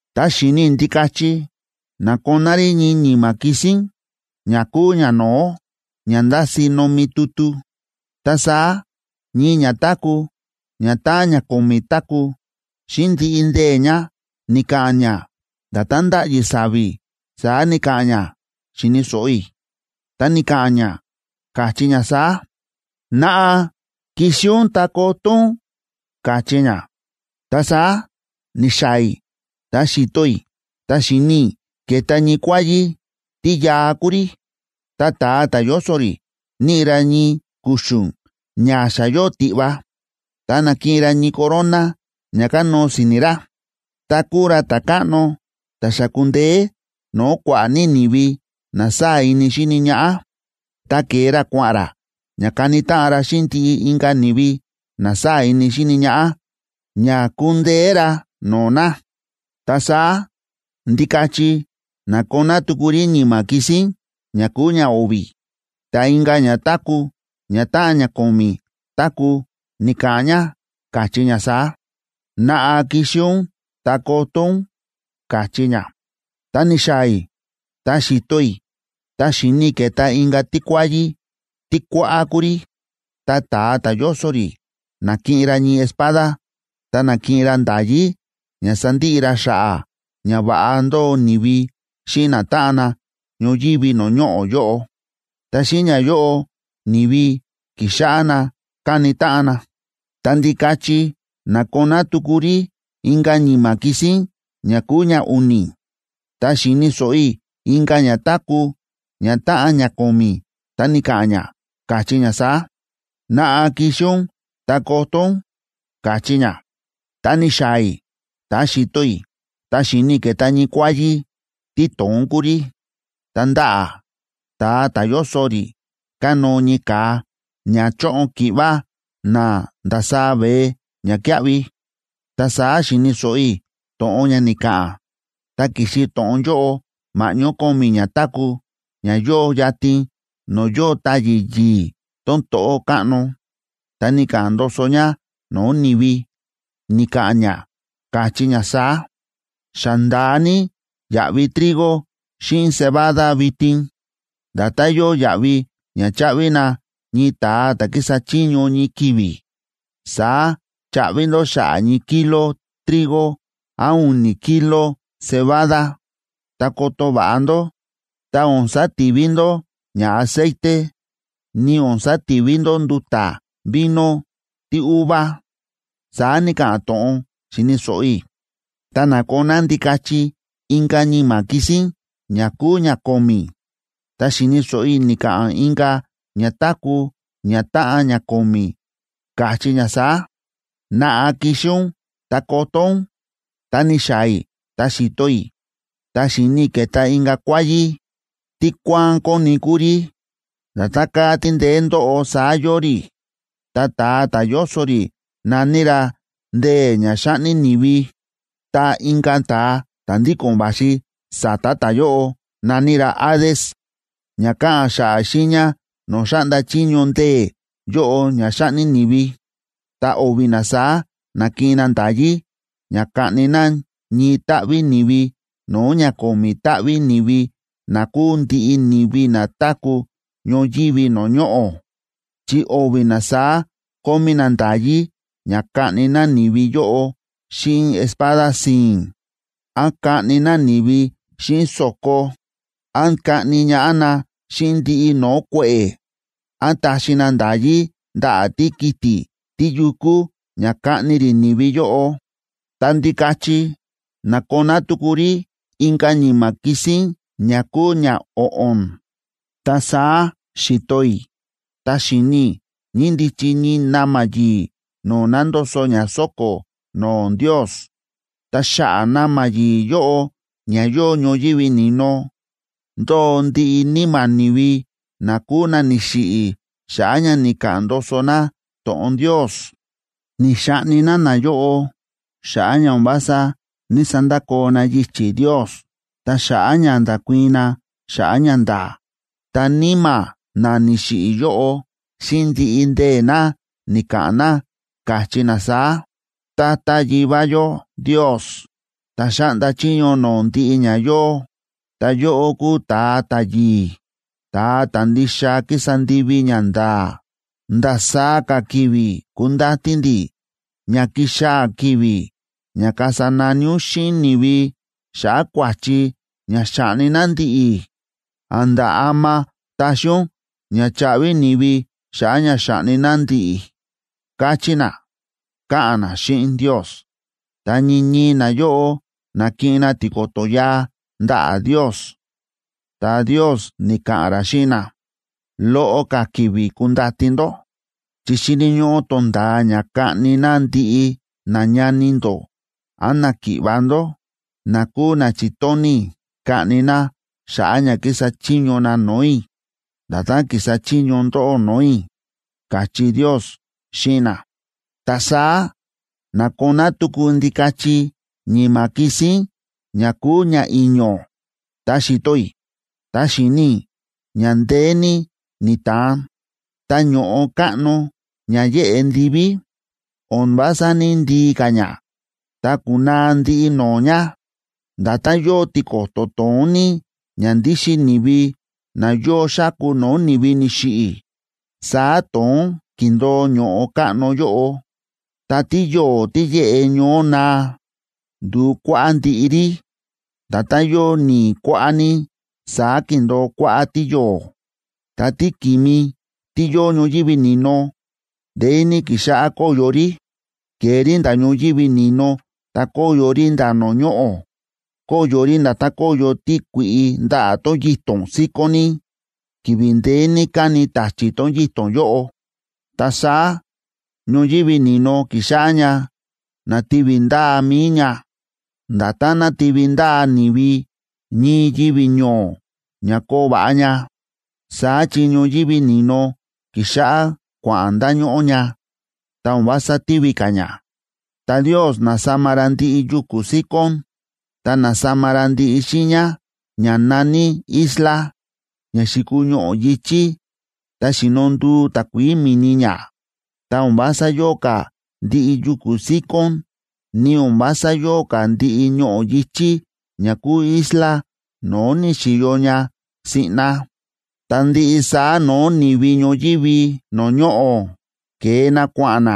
Ta xi̱ni i̱ Ndikachi na̱koná rí ñii ñi̱ma̱ kisín ña kúu ñano̱ó ña ndási nomi tutu. Ta saá ñii ñatáku̱ ñatáꞌan ña ko̱mi̱ táku̱, xíꞌin ndiꞌi ndee̱ ña ni̱ka̱ꞌa̱n ña, nda̱tán ndáꞌyi sa̱vi̱ saá ni̱ka̱ꞌa̱n ña xi̱ni̱ so̱ꞌo i̱, ta ni̱ka̱ꞌa̱n ña, káchí ña saá: ―¡Naꞌa, kixi ún ta koto ún! ―káchí ña. Ta saá ni̱xaa̱ i̱ ta xi̱to i̱, ta xi̱ni i̱ ke̱ta ñii kuáyí, tí yaa kúu rí, ta ta̱a ta̱ yóso rí níꞌi ra ñii kuxu̱n ña xa yóo tiꞌva. Ta na̱kiꞌin ra ñii corona ña kanóo si̱ni̱ ra. Ta kúu ra ta̱káꞌno ta̱ xa ku̱ndeé no̱o̱ kua̱ꞌa̱ ní ni̱vi na sáa̱ ini xíni ñaꞌá, ta ke̱e ra kua̱ꞌa̱n ra ña kani táꞌan ra xíꞌin ndiꞌi inka̱ ni̱vi na sáa̱ ini xíni ñaꞌá, ña kundeé ra no̱o̱ na. Ta saá Ndikachi na̱koná tuku rí ñi̱ma̱ kisín ña kúu ñao̱vi̱, ta inka̱ ñatáku̱ ñatáꞌan ña ko̱mi̱ táku̱ ni̱ka̱ꞌa̱n ña, káchí ña saá: ―¡Naꞌa, kixi ún ta koto ún! ―káchí ña. Ta ni̱xaa̱ i̱ ta xi̱to i̱, ta xi̱ni i̱ ke̱ta inka̱ tíkuáyí, tí kuáꞌá kúu rí. Ta ta̱a ta̱ yóso rí na̱kiꞌin ra ñii espada, ta na̱kiꞌin ra nda̱yí ña sandiꞌi ra xa̱ꞌa̱ ña va̱ꞌa ndóo ni̱vi xíꞌin natáꞌan na ñoyívi no̱o̱ ñoꞌo̱ yóꞌo. Ta xíꞌin ñayóꞌo ni̱vi kixáꞌá na kaꞌni táꞌan na. Ta Ndikachi na̱koná tuku rí inka̱ ñi̱ma̱ kisín ña kúu ñau̱ni̱, ta xi̱ni̱ so̱ꞌo i̱ inka̱ ñatáku̱ ñatáꞌan ña ko̱mi̱, ta ni̱ka̱ꞌa̱n ña, káchí ña saá: ―¡Naꞌa, kixi ún ta koto ún! ―káchí ña. Ta ni̱xaa̱ i̱ ta xi̱to i̱, ta xi̱ni i̱ ke̱ta ñii kuáyí, tí to̱ón kúu rí, ta ndaꞌa̱ ta̱a ta̱ yóso rí kánóo ñii ka̱a ña choꞌon ki̱ꞌva na ndasaá veé ñakíaꞌvi. Ta saá xi̱ni̱ so̱ꞌo i̱ to̱ꞌon ña ni̱ka̱ꞌa̱n, ta ki̱xi to̱ꞌon yóꞌo ma̱ꞌñó ko̱mi̱ ñatáku̱ ña yóo yatin no̱o̱ yóo táyi̱ yi̱i̱ tón to̱ꞌó káꞌno. Ta ni̱ka̱ꞌa̱n ndoso ña no̱o̱ ni̱vi, ni̱ka̱ꞌa̱n ña, káchí ña saá: ―Xa nda̱a ní yaꞌvi trigo xíꞌin cebada vitin. Nda̱tán yóo yaꞌvi ña cháꞌvi na ñii ta̱a ta̱ ki̱sa chiño ñii ki̱vi̱, saá chaꞌvi ndó xa̱ꞌa̱ ñii kilo trigo án u̱ni̱ kilo cebada.a Ta koto va̱ꞌa ndó, ta o̱n sativi ndó ña aceite, ni o̱n sativi ndó nduta̱ vino tíuva ―saá ni̱ka̱ꞌa̱n to̱ꞌon xi̱ni̱ so̱ꞌo i̱. Ta na̱koná Ndikachi inka̱ ñi̱ma̱ kisín ña kúu ñako̱mi̱, ta xi̱ni̱ so̱ꞌo i̱ ni̱ka̱ꞌa̱n inka̱ ñatáku̱ ñatáꞌan ña ko̱mi̱, káchí ña saá: ―¡Naꞌa, kixi ún ta koto ún! Ta ni̱xaa̱ i̱ ta xi̱to i̱, ta xi̱ni i̱ ke̱ta inka̱ kuáyí, tí kuáán kóni kúu rí. Nda̱tán káa tí ndeé ndóꞌo saá yóo rí. Ta ta̱a ta̱ yóso rí na̱ní ra “Ndee̱ ña xáꞌni ni̱vi.” Ta inka̱ ta̱a ta̱ ndíko̱n va̱xi sa̱ta̱ ta̱yóꞌo na̱ní ra “Hades” ña káꞌa̱n xa̱ꞌa̱ xiiña no̱o̱ xáꞌnda chiño ndee̱ yóꞌo ña xáꞌni ni̱vi. Ta o̱vi̱ na saá na̱kiꞌin na nda̱yí ña kaꞌni na ñii táꞌví ni̱vi no̱o̱ ña ko̱mi̱ táꞌví ni̱vi na kúu ndiꞌi ni̱vi na táku̱ ñoyívi no̱o̱ ñoꞌo̱. Chi o̱vi̱ na saá kómí na nda̱yí ña kaꞌni na ni̱vi yóꞌo xíꞌin espada si̱i̱n, án kaꞌni na ni̱vi xíꞌin so̱ko, án kaꞌni ñaꞌá na xíꞌin ndiꞌi no̱o̱ kue̱ꞌe̱, án taxi na nda̱yí ndaꞌa̱ tíkiti̱ tíyukú ña kaꞌni rí ni̱vi yóꞌo. Ta Ndikachi na̱koná tuku rí inka̱ ñi̱ma̱ kisín ña kúu ñao̱ꞌo̱n. Ta saá xi̱to i̱, ta xi̱ni̱ i̱ ñíndichi ñii na̱ma̱ yi̱i̱ no̱o̱ na̱ndoso ña sóko̱ no̱o̱ Ndios, ta xa̱ꞌa̱ na̱ma̱ yi̱i̱ yóꞌo ña yóo ñoyívi ni̱no, ndóo ndiꞌi níma̱ ni̱vi na kúu na ni̱xiꞌi̱ xa̱ꞌa̱ ña ni̱ka̱ꞌa̱n ndoso na to̱ꞌon Ndios. Ni̱xaꞌni na nayóꞌo xa̱ꞌa̱ ña o̱n vása ní‑sandakoo na yichi̱ Ndios ta xa̱ꞌa̱ ña nda̱kuii̱n na xa̱ꞌa̱ ñanda̱a̱. Ta níma̱ na ni̱xiꞌi̱ yóꞌo, xíꞌin ndiꞌi ndee̱ na ni̱ka̱ꞌa̱n na, káchí na saá: ―Tata Yivá yó Ndios, ta̱ xáꞌnda chiño no̱o̱ ndiꞌi ña yóo, ta yóꞌó kúu ta̱a ta̱yi̱i̱, ta̱a ta̱ ndixa kísa ndivi ñanda̱a̱, ¿ndasaá ka̱ ki̱vi̱ kundati ndi̱ ña kixaa̱ ki̱vi̱ ña kasa nani ún xíꞌin ni̱vi xa̱ꞌa̱ kua̱chi ña xa̱ꞌni na ndi̱ꞌi̱? ¿A̱nda̱ ama taxi ún ña chaꞌvi ni̱vi xa̱ꞌa̱ ña xa̱ꞌni na ndi̱ꞌi̱? ―káchí na, káꞌa̱n na xíꞌin Ndios. Ta ñii ñii nayóꞌo na̱kiꞌin na tiko̱to̱ yaa ndaꞌa̱ Ndios, ta Ndios ni̱ka̱ꞌa̱n ra xíꞌin na: ―Loꞌo ka̱ ki̱vi̱ kundati ndó, chi xíni̱ ñóꞌó tonda̱a ña kaꞌni na ndiꞌi nañani ndó án náki̱ꞌva̱ ndó, na kúu na chi̱tóni̱ i̱ kaꞌni na xa̱ꞌa̱ ña kísa chiño na no̱o̱ i̱, nda̱tán ki̱sa chiño ndóꞌó no̱o̱ i̱ ―káchí Ndios xíꞌin na. Ta saá na̱koná tuku Ndikachi ñi̱ma̱ kisín ña kúu ñai̱ño̱. Ta xi̱to i̱, ta xi̱ni i̱ ña ndeé ní ni̱ta̱an, ta ño̱ꞌo káꞌno ña yéꞌe ndiví, o̱n vása ní‑ndii ka̱ ña, ta ku̱naa ndiꞌi no̱o̱ ña. Nda̱tán yóo tiko̱to̱ to̱ón ní ña ndíxin ni̱vi na yóo xáku no̱o̱ ni̱vi ni̱xiꞌi̱, saá to̱ón ki̱ndo̱o ño̱ꞌo káꞌno yóꞌo. Ta tíyo̱o̱ tí yéꞌe ñoó naa, ndu̱u kuáꞌá ndiꞌi rí. Nda̱tán yóo ni̱i̱ kuáꞌá ní, saá ki̱ndo̱o kuáꞌá tíyo̱o̱. Ta tíki̱mi tí yóo ñoyívi ni̱no, ndeé ní ki̱xáꞌá kóyo rí. Ke̱e rí nda̱ ñoyívi ni̱no ta kóyo rí nda̱ no̱o̱ ñoꞌo̱. Kóyo rí nda̱tán kóyo tíkui̱ꞌi ndaꞌa̱ tón yito̱n síkón ní, ki̱vi̱ ndeé ní káni ta̱chi̱ tón yito̱n yóꞌo. Ta saá ñoyívi ni̱no ki̱xáꞌá ña nátivi ndaa mi̱i ña, nda̱tán nátivi ndaa ni̱vi ñii yivi̱ ño̱o̱ ña koo va̱ꞌa ña. Saá chi ñoyívi ni̱no ki̱xáꞌá kua̱ꞌa̱n ndañóꞌó ña, ta o̱n vása tívi ka̱ ña. Ta Ndios na̱sama ra ndiꞌi yuku̱ síkón, ta na̱sama ra ndiꞌi xiiña ña na̱ní isla, ña xi̱kuu ñoꞌo̱ yi̱chí, ta xi̱no ndu̱u takuií mi̱ni ña. Ta o̱n vása yóo ka̱ ndiꞌi yuku̱ síkón, ni o̱n vása yóo ka̱ ndiꞌi ñoꞌo̱ yi̱chí ña kúu isla no̱o̱ ni̱xi̱yo ña siꞌna. Ta ndiꞌi saá no̱o̱ ni̱vi ñoyívi no̱o̱ ñoꞌo̱ ke̱e na kua̱ꞌa̱n na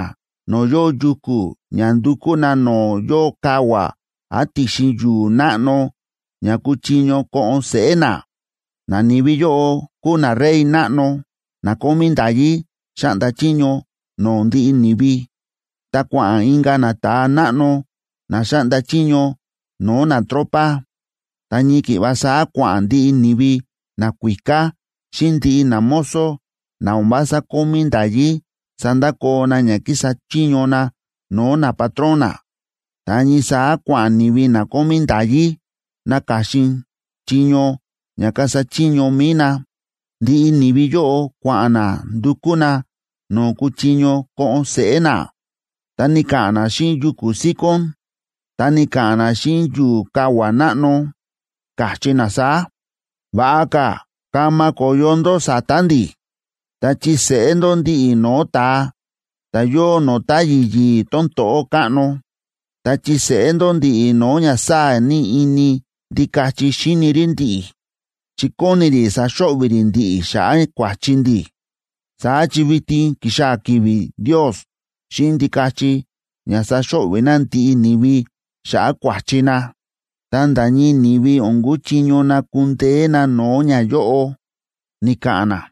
no̱o̱ yóo yuku̱ ña ndukú na no̱o̱ yóo kavua̱ án ti̱xin yu̱u̱ náꞌno ña kuchiño ko̱ꞌo̱n seꞌé na. Nani̱vi yóꞌo kúu narey náꞌno na kómí nda̱yí xáꞌnda chiño no̱o̱ ndiꞌi ni̱vi, ta kua̱ꞌa̱n inka̱ nata̱a náꞌno na xáꞌnda chiño no̱o̱ natropa. Ta ñii ki̱ꞌva saá kua̱ꞌa̱n ndiꞌi ni̱vi nakuíká xíꞌin ndiꞌi namozo na o̱n vása kómí nda̱yí sandakoo na ña kísa chiño na no̱o̱ napatrón na, ta ñii saá kua̱ꞌa̱n ni̱vi na kómí nda̱yí naka̱xin chiño ña kasa chiño mi̱i na. Ndiꞌi ni̱vi yóꞌo kua̱ꞌa̱n na ndukú na no̱o̱ kuchiño ko̱ꞌo̱n seꞌé na, ta ni̱ka̱ꞌa̱n na xíꞌin yuku̱ síkón, ta ni̱ka̱ꞌa̱n na xíꞌin yu̱u̱ kavua̱ náꞌno, káchí na saá: ―Va̱ꞌa ka̱ kama ko̱yo ndó sa̱ta̱ ndi̱, ta chiseꞌé ndó ndi̱ꞌi̱ no̱o̱ ta̱a ta̱ yóo no̱o̱ táyi̱ yi̱i̱ tón to̱ꞌó káꞌno. Ta chiseꞌé ndó ndi̱ꞌi̱ no̱o̱ ña sáa̱ ní ini Ndikachi xíni rí ndi̱ꞌi̱, chi kóni rí saxo̱ꞌvi̱ rí ndi̱ꞌi̱ xa̱ꞌa̱ kua̱chi ndi̱. Saá chi vitin ki̱xaa̱ ki̱vi̱ Ndios xíꞌin Ndikachi ña saxo̱ꞌvi̱ na ndiꞌi ni̱vi xa̱ꞌa̱ kua̱chi na. Ta nda̱ ñii ni̱vi o̱n kuchiño na kundeé na no̱o̱ ñayóꞌo ―ni̱ka̱ꞌa̱n na.